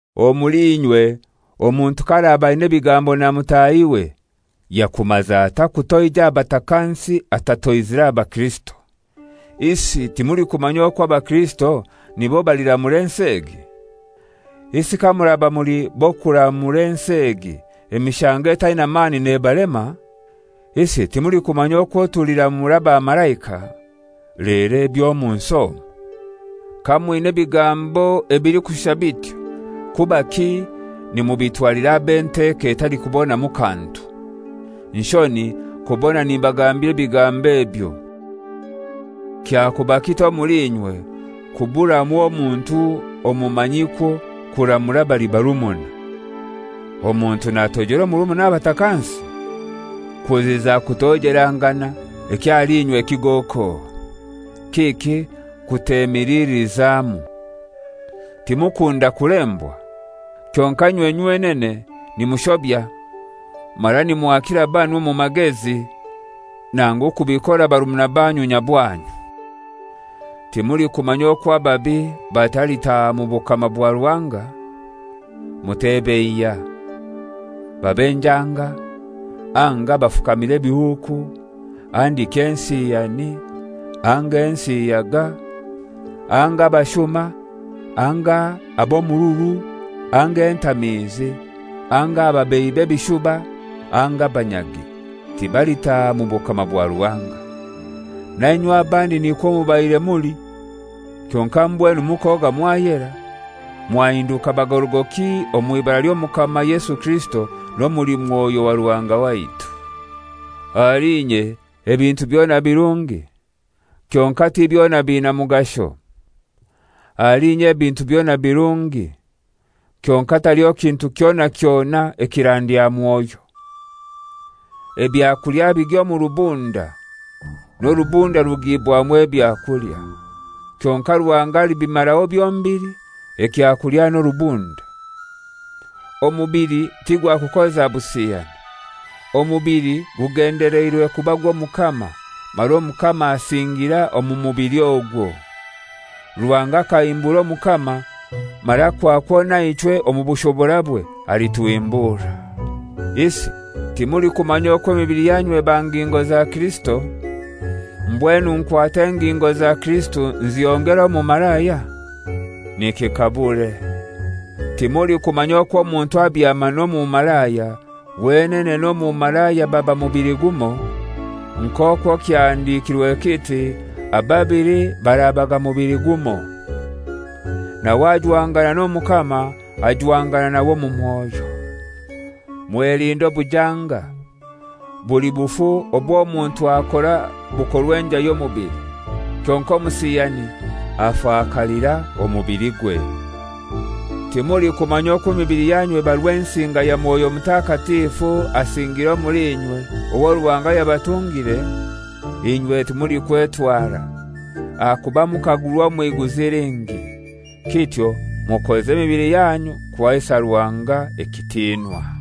Omuli inywe omuntu k'araba aina ebigambo na mutahiwe, yakumaza atai kutoija aha batakansi atatoizire aha baKirisito? Isi timulikumanya okwo abakirisito nibo baliramura ensi egi? Isi kamuraba muli b'okuramura ensi egi, emishango etaina mani nebalema? Isi timulikumanya okwo tuliramura abamalaika? Lero eby'omu nsi omu! Kamwina ebigambo ebilikushusha bityo, kubaki nimubitwalira ab'enteko etalikubonamu kantu? Nshoni kubona nimbagambira ebigambo ebyo. Kyakuba kitai omuli inywe kuburamu omuntu omumanyikwo kuramura abali barumuna? Omuntu natoijera omurumuna aha batakansi? Kuziza kutoijelangana ekyo ahali inywe kigoko. Kiki kutemilililizamu? Timukunda kulembwa? Kyonkai inywe nywenene nimushobya mara nimwakira banu omu magezi, nangu kubikora barumuna banyu nyabwanyu! Timulikumanya okwo ababi batalitaaha mu bukama bwa Ruhanga? Mutebeiya; babe njanga, anga abafukamira ebihuuku, handiki ensiyani, anga ensiyaga, anga abashuma, anga ab'omururu, anga entamiizi, anga ababeihi b'ebishuba, anga abanyagi, tibalitaha omu bukama bwa Ruhanga. Nainywe abandi nikwo mubaire muli. Kyonkai mbwenu mukoga mwayera, mwahinduka bagorogoki omw'ibara ly'Omukama Yesu Kirisito n'omuli Mwoyo wa Ruhanga waitu. «Ahali inye ebintu byona birungi,» kyonkai ti byona biina mugasho. «Ahali inye ebintu byona birungi,» kyonkai taliho kintu kyona kyona ekirandya mwoyo. «Ebyakulya bigya omu rubunda, n'orubunda rugibwamu ebyakulya,» kyonkai Ruhanga alibimaraho byombili, ekyakulya n'orubunda. Omubili tigwakukoza busiyani. Omubili gugendeleirwe kuba gw'Omukama, mara Omukama asingira omu mubili ogwo. Ruhanga akahimbura Omukama mara kwakwo naichwe omu bushoborabwe alituhimbura. Isi timulikumanya okwo emibili yanyu eba ngingo za Kirisito? Mbwenu nkwate engingo za Kirisito nzihongere omumalaya? Nikikabure! Timulikumanya okwo omuntu abyama n'omumalaya, wenene n'omumalaya ababa mubili gumoi? Nk'okwo kyahandikirwe kiti, «Ababili barabaga mubili gumoi.» Nawe ajwangana n'Omukama ajwangana nawe omu mwoyo. Mwelinde obujanga. Buli bufu obw'omuntu akora bukorwa enjai y'omubili; kyonkai omusiyani afakalira omubiligwe. Timulikumanya okwo emibili yanyu eba Rwensinga ya mwoyo Mutakatifu asingiire omuli inywe, owo Ruhanga yabatungire? Inywe timulikwetwara; ahakuba mukagurwa omw'iguzi lingi. Kityo mukoze emibili yanyu kuhaisa Ruhanga ekitinwa.